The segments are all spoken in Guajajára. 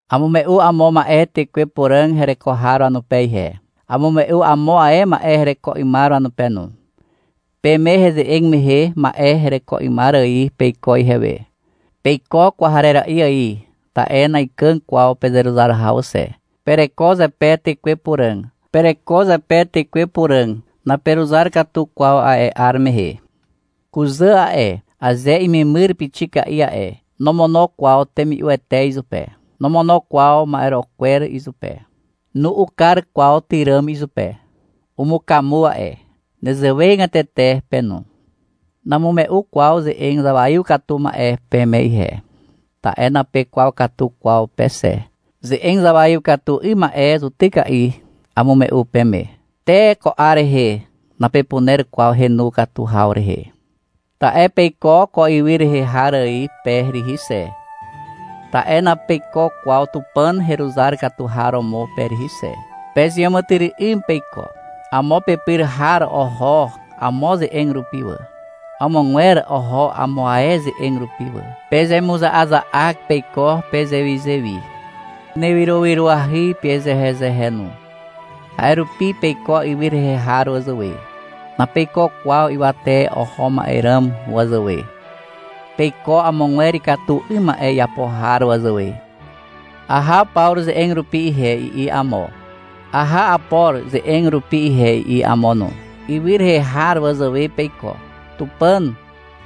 Amume'u amo ma'e Tekwe Puràg hereko har wanupe ihe. Amume'u amo ae ma'e hereko 'ymar wanupe no. Peme heze'eg mehe ma'e hereko 'ymar ài peiko ihewe. Peiko kwarera'i ài ta'e na'ikàg kwaw pezeruzar haw xe. Pereko zepe Tekwe Puràg, naperuzar katu kwaw a'e 'ar mehe. Kuzà a'e, aze imemyr pixika'i a'e, nomono kwaw temi'uete izupe. Nomono kwaw ma'ero'o kwer izupe. Nu'u kar kwaw tyràm izupe. Umukamu a'e. Nezewegatete pe no. Namume'u kwaw ze'eg zawaiw katu ma'e peme ihe. Ta'e napekwaw katu kwaw pe xe. Ze'eg zawaiw katu 'ym ma'e zutyka'i amume'u peme. Te ko 'ar rehe napepuner kwaw henu katu haw rehe. Ta'e peiko ko ywy rehe har ài pe rihi xe. (Ta'e napeiko kwaw Tupàn heruzar katu har romo pe rihi xe.) Pezeàmàtyry'ym peiko. Amo pepyr har oho amo ze'eg rupi wà. Amogwer oho amo ae ze'eg rupi wà. Pezemuza'aza'ak peiko pezewizewi. Penewyrowyroahy pezehezehe no. A'e rupi peiko ywy rehe har wazàwe. (Napeiko kwaw ywate oho ma'e ràm wazàwe.) Peiko amogwer ikatu 'ym ma'e iapo har wazàwe. — Aha Pawru ze'eg rupi ihe, i'i amo. — Aha Apor ze'eg rupi ihe, i'i amo no. Ywy rehe har wazàwe peiko. Tupàn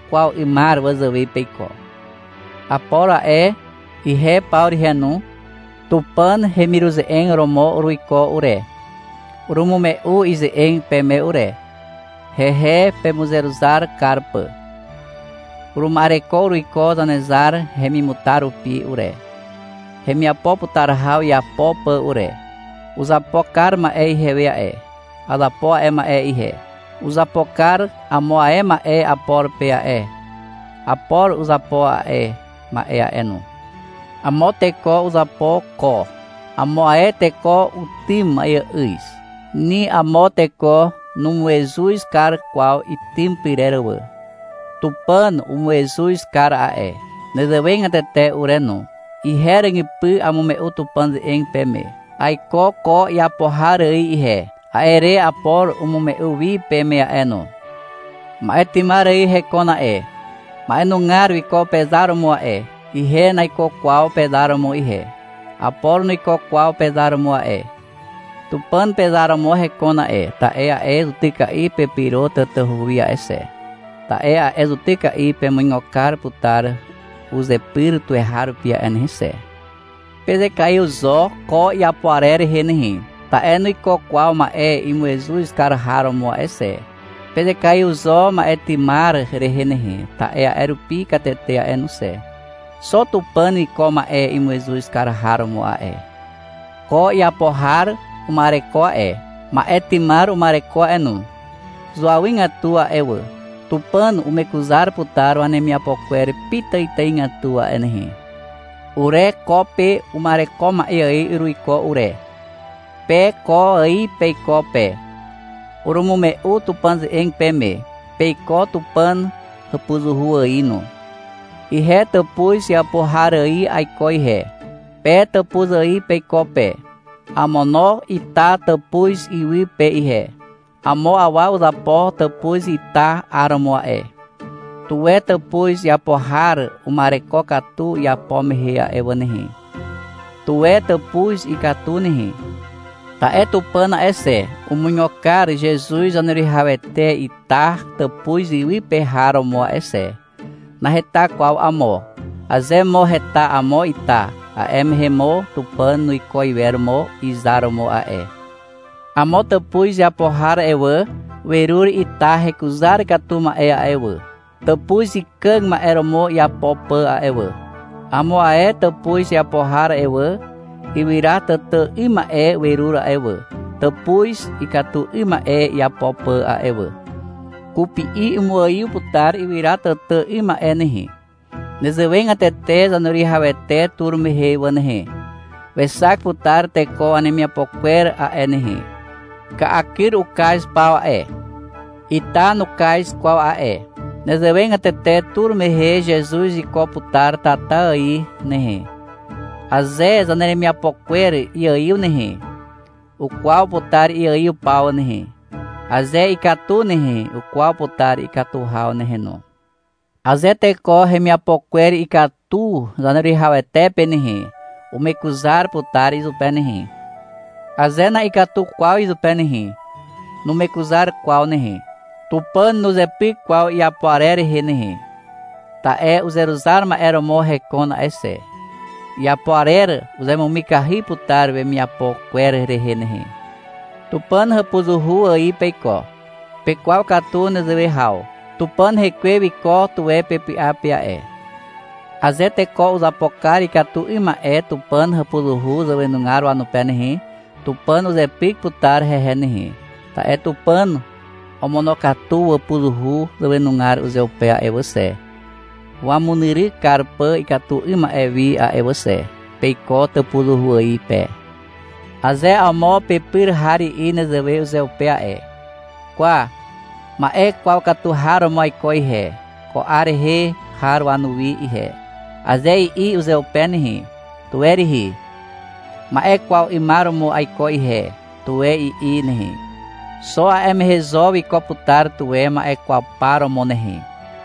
kwaw 'ymar wazàwe peiko. Apor a'e, ihe Pawru ihe no, Tupàn hemiruze'eg romo uruiko ure. Urumume'u ize'eg peme ure, hehe pemuzeruzar kar pà. Uruma'ereko uruiko Zanezar hemimutar rupi ure, hemiapo putar haw iapo pà ure. Uzapo kar ma'e ihewe a'e. Azapo a'e ma'e ihe. Uzapo kar amo ae ma'e Apor pe a'e. Apor uzapo a'e ma'e a'e no. Amo teko uzapo ko. Amo ae teko utym ma'eà'yz. Ni amo teko numuezuz kar kwaw itym pyrer wà. Tupàn umuezuz kar a'e. Nezewegatete ure no. Ihe ràgypy amume'u Tupàn ze'eg peme. Aiko ko iapo har ài ihe. A'e re Apor umume'u wi peme a'e no. Ma'e tymar ài hekon a'e. Ma'enugar wiko pezar romo a'e. Ihe naiko kwaw pezar romo ihe. Apor nuiko kwaw pezar romo a'e. Tupàn pezar romo hekon a'e, ta'e a'e zutyka'i pepyro tatahu wi a'e xe, ta'e a'e zutyka'i pemuigo kar putar uzepyr tuweharupi a'e nehe xe. Pezekaiw zo ko iapo arer rehe nehe, ta'e nuiko kwaw ma'e imuezuz kar har romo a'e xe. Pezekaiw zo ma'e tymar rehe nehe, ta'e a'e rupi katete a'e no xe. Xo Tupàn wiko ma'e imuezuz kar har romo a'e. Ko iapo har uma'ereko a'e. Ma'e tymar uma'ereko a'e no. Zuawygatu a'e wà. Tupàn umekuzar putar wanemiapo kwer pitàitàigatu a'e nehe. Ure ko pe uma'ereko ma'e ài uruiko ure. Pe ko ài peiko pe. Urumume'u Tupàn ze'eg peme. Peiko Tupàn hàpuzuhu ài no. Ihe tàpuz iapo har ài aiko ihe. Pe tàpuz ài peiko pe. Amono ita tàpuz iwy pe ihe. Amo awa uzapo tàpuz ita 'aromo a'e. Tuwe tàpuz iapo har uma'ereko katu iapo mehe a'e wà nehe, tuwe tàpuz ikatu nehe. Ta'e Tupàn a'e xe, umuigo kar Zezuz Zaneruwihawete ita tàpuz iwy pe har romo a'e xe. Naheta kwaw amo. Aze mo heta amo ita, a'e mehe mo Tupàn nuiko iwer mo izar romo a'e. Amo tàpuz iapo har a'e wà, werur ita hekuzar katu ma'e a'e wà, tàpuz ikàg ma'e romo iapo pà a'e wà. Amo ae tàpuz iapo har a'e wà, ywyra tàtà 'ym ma'e werur a'e wà, tàpuz ikatu 'ym ma'e iapo pà a'e wà. Kupi'i umuaiw putar ywyra tàtà 'ym ma'e nehe. Nezewegatete Zaneruwihawete tur mehe wà nehe, wexak putar teko wanemiapo kwer a'e nehe. Ka'a kyr ukaz paw a'e. Ita nukaz kwaw a'e. Nezewegatete tur mehe Zezuz wiko putar tata ài nehe. Aze zaneremiapo kwer iaiw nehe, ukwaw putar iaiw paw nehe. Aze ikatu nehe, ukwaw putar ikatu haw nehe no. Aze teko hemiapo kwer ikatu Zaneruwihawete pe nehe, umekuzar putar izupe nehe. Aze na'ikatu kwaw izupe nehe, numekuzar kwaw nehe. Tupàn nuzepyk kwaw iapo arer rehe nehe, ta'e uzeruzar ma'e romo hekon a'e xe. Iapo arer uzemumikahy putar wemiapo kwer rehe nehe. Tupàn hàpuzuhu ài peiko. Pekwaw katu nezewe haw. Tupàn Hekwe wiko tuwe pepy'a pe a'e. Aze teko uzapo kar ikatu 'ym ma'e Tupàn hàpuzuhu zàwenugar wanupe nehe, Tupàn uzepyk putar hehe nehe, ta'e Tupàn omonokatu wàpuzuhu zàwenugar uzeupe a'e wà xe, wamunyryk kar pà ikatu 'ym ma'e wi a'e wà xe. Peiko tàpuzuhu ài pe. Aze amo pepyr har i'i nezewe uzeupe a'e. — Kwa, ma'e kwaw katu har romo aiko ihe, ko 'ar rehe har wanuwi ihe, aze i'i uzeupe nehe, tuwe rihi. — Ma'e kwaw 'ymar romo aiko ihe, tuwe i'i nehe. Xo a'e mehe zo wiko putar tuwe ma'e kwaw par romo nehe.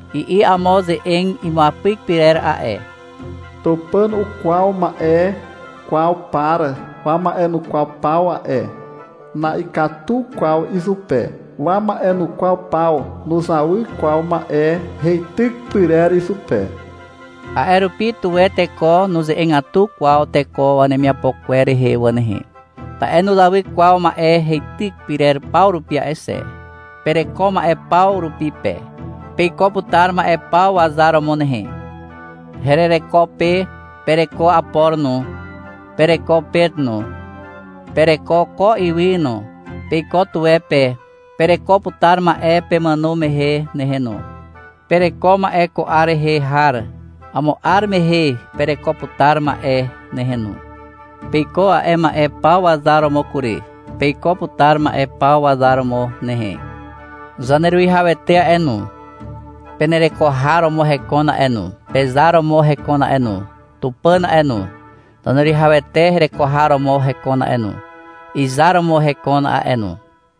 I'i amo ze'eg imuapyk pyrer a'e. — Tupàn ukwaw ma'e kwaw par wama'enukwaw paw a'e. Na'ikatu kwaw izupe. Wama'enukwaw paw nuzawy kwaw ma'e heityk pyrer izupe. A'e rupi, tuwe teko nuze'egatu kwaw teko wanemiapo kwer rehe wà nehe. Ta'e nuzawy kwaw ma'e heityk pyrer paw rupi a'e xe. Pereko ma'e paw rupi pe. Peiko putar ma'e paw wazar romo nehe. Herereko pe. Pereko Apor no, pereko Pet no, pereko ko ywy no, peiko tuwe pe. Pereko putar ma'e pemàno mehe nehe no. Pereko ma'e ko 'ar rehe har. Amo 'ar mehe pereko putar ma'e nehe no. Peiko a'e ma'e paw wazar romo kury. Peiko putar ma'e paw wazar romo nehe. Zaneruwihawete a'e no, penereko har romo hekon a'e no, pezar romo hekon a'e no. Tupàn a'e no, Zaneruwihawete hereko har romo hekon a'e no, izar romo hekon a'e no.